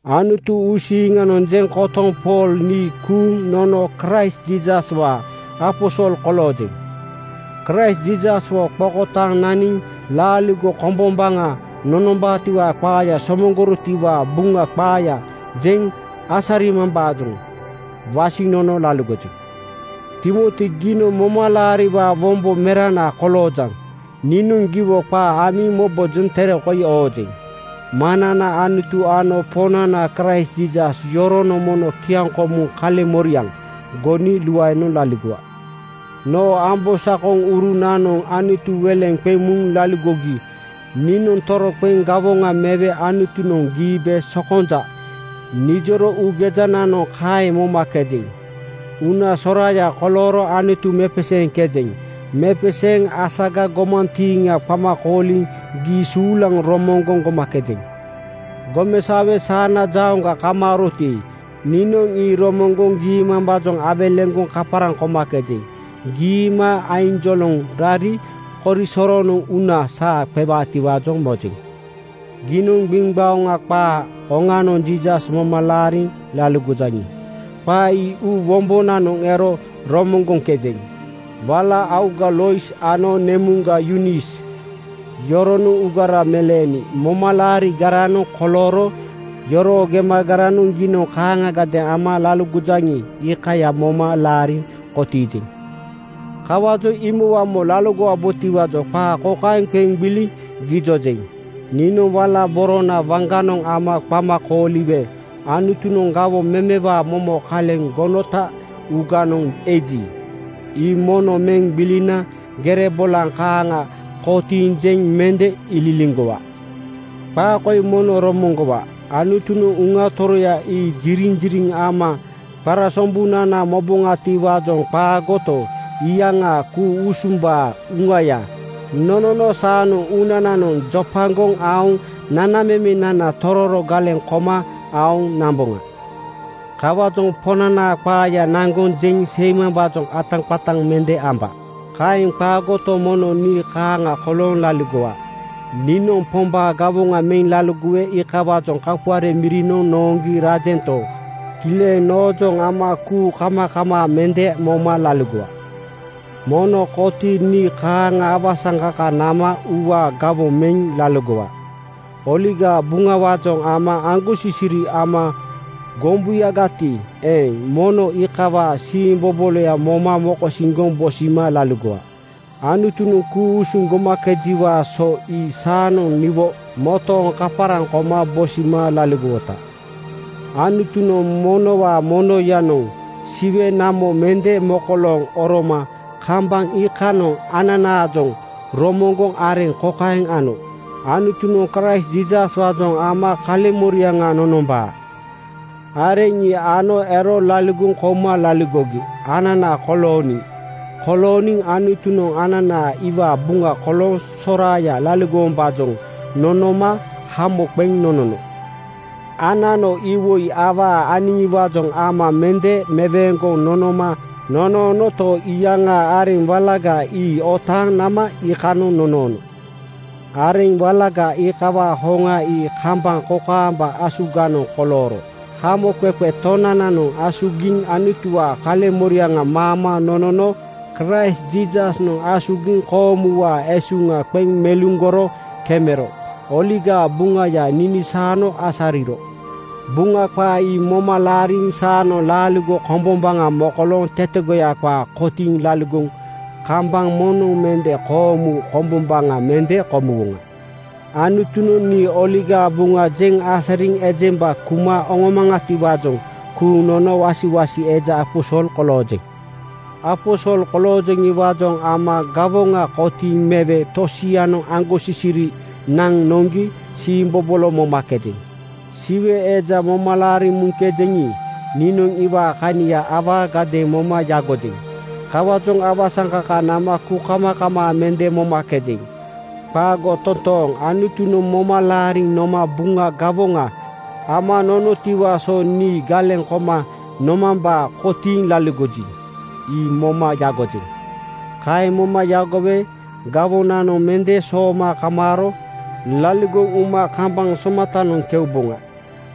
Anutu uusiiŋanoŋ jeŋ kotoŋ Pool nii kuuŋ nono Kraist Jiisaswaa aposol koloojeŋ. Kraist Jiisaswo qokotaaŋ naniŋ laaligo kombombaŋa nonombaatiwaa qaaya somoŋgorotiwaa Buŋa qaaya jeŋ asarimambaajoŋ wasiŋ nono laligojeŋ. Timoti giinoŋ momalaariwaa wombo merana koloojaŋ. Niinoŋ giwo qaa amiŋ mobojoŋ tere koi oojeŋ. Maŋnana Anutu ano Poŋnana Kraist Jiisas, yoronoŋ mono kiaŋkomuŋ kaleŋmoriaŋ goni luaenoŋ laligowa. Noo ambosakonurunanoŋ Anutu weleŋ qeŋ muŋ laligogi niinoŋ toroqeŋ gawoŋa mewe Anutunoŋ “Giibe sokonja,” nijoro uugejananoŋ kaeŋ momakejeŋ. Uuna soraaya kolooro Anutu mepeseeŋkejeŋ. Mepeseeŋ asaga gomantiiŋa qama kooliŋ gii suulaŋ romoŋgoŋ gomakejeŋ. Gomesaowe saana jauŋga kamaaroti, niinoŋ ii romoŋgoŋ giimambaajoŋ awelegoŋ kaparaŋ komakejeŋ. Giima ainjoloŋ rari korisoronoŋ uuna saa qewaatiwaajoŋ mojeŋ. Giinoŋ gbiŋgbaoŋa qaa oŋanoŋ Jiisas moma laariŋ laligojaŋi, qaa ii uu wombonanoŋ ero romoŋgoŋkejeŋ. Wala auga Lois ano nemuŋga Yunis yoronoŋ uugara meleeni momalaarigaranoŋ kolooro. Yoroo gemagaranoŋ giinoŋ kaaŋagadeeŋ ama laligojaŋi, iikaya moma laariŋ kotiijeŋ. Kawaajoŋ imowamo laligowabotiwaajoŋ qaa kokaeŋ qeŋ gbiliŋ gijojeŋ: Niinoŋ wala borona waŋganoŋ ama qama kooliwe Anutunoŋ gawoŋ memewaa momo kaleŋ gonota uuganoŋ eji, ii mono meŋ gbilina gere bolaŋ kaaŋa kotiiŋ jeŋ mende ililiŋgowa. Qaa koi mono romoŋgowa: Anutunoŋ Uŋa Toroya ii jiriŋjiriŋ ama qarasombunana moboŋatiwaajoŋ qaagoto, iyaŋaa ku-usumbaa Uŋaya nonono saanoŋ uunananoŋ jopagoŋ aoŋ nanamemenana tororo galeŋ koma aoŋ namboŋa. Kawaajoŋ Poŋnanaa qaaya naŋgoŋ jeŋ seimambaajoŋ ataqataŋ mende amba. Kaeŋ qaagoto, mono nii kaaŋa kolooŋ laligowa. Niinoŋ Pombaa gawoŋa meŋ laligowe iikawaajoŋ kapuare mirinoŋ nooŋgi rajento, kileŋ noojoŋ ama kuukamakamaa mende moma laligowa. Mono kotiiŋ nii kaaŋa awasaŋkaka nama uuwaa gawoŋ meŋ laligowa. Oligaa Buŋawaajoŋ ama aŋgosisiri ama gombuyagati eeŋ, mono iikawaa siimboboloya moma mokosiŋgoŋ bosima laligowa. Anutunoŋ ku-usuŋ gomakejiwaa so ii saanoŋ niwo motooŋ kaparaŋ koma bosima laligowota. Anutunoŋ monowaa monoyanoŋ Siwe namo mende mokolooŋ oroma kambaŋ iikanoŋ ananaajoŋ romoŋgoŋ areŋ kokaeŋ ano: Anutunoŋ Kraist Jiisaswaajoŋ ama kaleŋmoriaŋ nonombaa. Areŋ ii ano ero laligoŋ kouma laligogi anana kolooniŋ. Kolooniŋ Anutunoŋ anana iwaa buŋa kolooŋ soraaya laligowombaajoŋ nonooma hamo qeŋ nonono. Anano iwoi awaa aniŋiwaajoŋ ama mende meweeŋgoŋ nonoma nonoonoto, iyaŋaa areŋ walaga ii otaaŋ nama iikanoŋ nonoono. Areŋ walaga iikawaa hoŋa ii kambaŋ kokaamba asuganoŋ kolooro. Hamoqeqe Tonananoŋ asugiŋ Anutuwaa kaleŋmoriaŋa maama nonono. Kraist Jiisasnoŋ asugiŋ koomuwaa esuŋa qeŋ meluŋgoro kemero Oligaa Buŋaya ninisaano asariro. Buŋa qaa ii moma laariŋ saanoŋ laaligo kombombaŋa mokolooŋ tetegoya qaa kotiiŋ laligoŋ kambaŋ moŋnoŋ mende koomu komboŋa mende komuwoŋa. Anutunoŋ nii Oligaa Buŋa jeŋ asariŋ ejemba kuma oŋomaŋatiwaajoŋ kuuŋ nono wasiwasi eja aposol koloojeŋ. Aposol koloojeŋiwaajoŋ ama gawoŋa kotiiŋ mewe tosianoŋ aŋgosisiri naŋ noŋgi siimbobolo momakejeŋ. Siwe Eja moma laariŋ muŋkejeŋi, niinoŋ iwaa kania awaagadeeŋ moma yagojeŋ. Kawaajoŋ awasaŋkaka nama kuukamakamaa mende momakejeŋ. Qaago totooŋ! Anutunoŋ moma laariŋ noma Buŋa gawoŋa ama nonotiwaa so nii galeŋ koma nomambaa kotiiŋ laligoji, ii moma yagojeŋ. Kaeŋ moma yagowe gawoŋanoŋ mende sooma kamaaro laligoŋ uma kambaŋ somatanoŋ keuboŋa.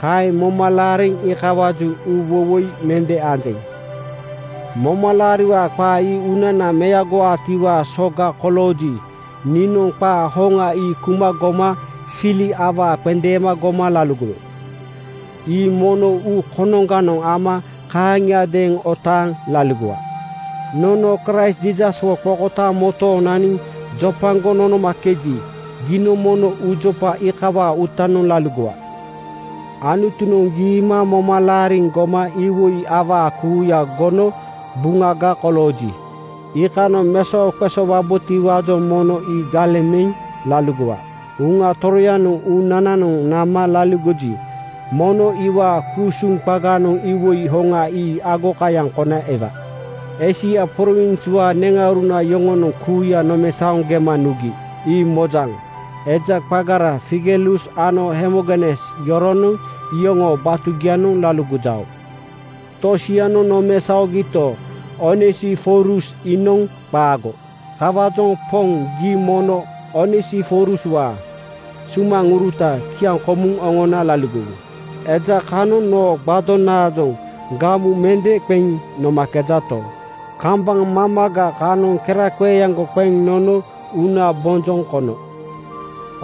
Kaeŋ moma laariŋ iikawaajoŋ uuwoiwoi mende anjeŋ. Momalaariwaa qaa ii uunana meagowaatiwaa soga kolooji, niinoŋ qaa hoŋa ii kuma goma sili awaa qendeema goma laligowe. Ii mono uu konoŋganoŋ ama kaaŋiadeeŋ otaaŋ laligowa. Nono Kraist Jiisaswo qokotaaŋ motooŋ naniŋ jopagoŋ nonomakeji, giinoŋ mono uujopa iikawaa uutanoŋ laligowa. Anutunoŋ giima moma laariŋ goma iwoi awaa kuuya gono buŋaga kolooji, iikanoŋ mesoqesoowabotiwaajoŋ mono ii galeŋ meŋ laligowa. Uŋa Toroyanoŋ uunananoŋ nama laligoji mono iwaa ku-usuŋ qaganoŋ iwoi hoŋa ii agokayaŋ kona ewaa. Eisia prowinswaa neŋauruna yoŋonoŋ kuuya nomesaoŋ gema nugi, ii mojaŋ. Eja qagara Figelus ano Hermogenes yoronoŋ iyoŋoo batugianoŋ laligojao. Tosianoŋ nomesaogito, Onesiforus iinoŋ qaago. Kawaajoŋ Poŋ, gii mono Onesiforuswaa sumaŋuruta kiaŋkomuŋ oŋona laligowu. Eja kanoŋ noo gbadonaajoŋ (tape) gamu mende qeŋ nomakejato, kambaŋ mamaga kanoŋ keraqeeaŋgo qeŋ nono uuna bonjoŋ kono.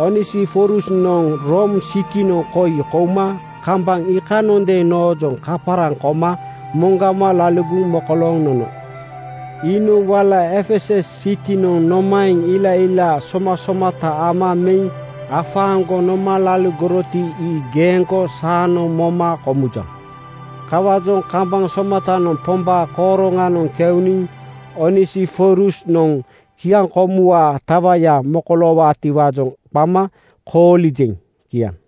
Onesiforusnoŋ Room sitinoŋ koi kouma kambaŋ iikanondeeŋ noojoŋ kaparaŋ koma moŋgama laligoŋ mokolooŋ nono. Iinoŋ wala Efesus sitinoŋ nomaeŋ ilailaa somasomata ama meŋ afaaŋgoŋ noma laligoroti ii geeŋgo saanoŋ moma komujaŋ. Kawaajoŋ kambaŋ somatanoŋ Pombaa kooroŋanoŋ keuniŋ Onesiforusnoŋ kiaŋkomuwaa tawaya mokoloowaatiwaajoŋ qama koolijeŋ. Kiaŋ.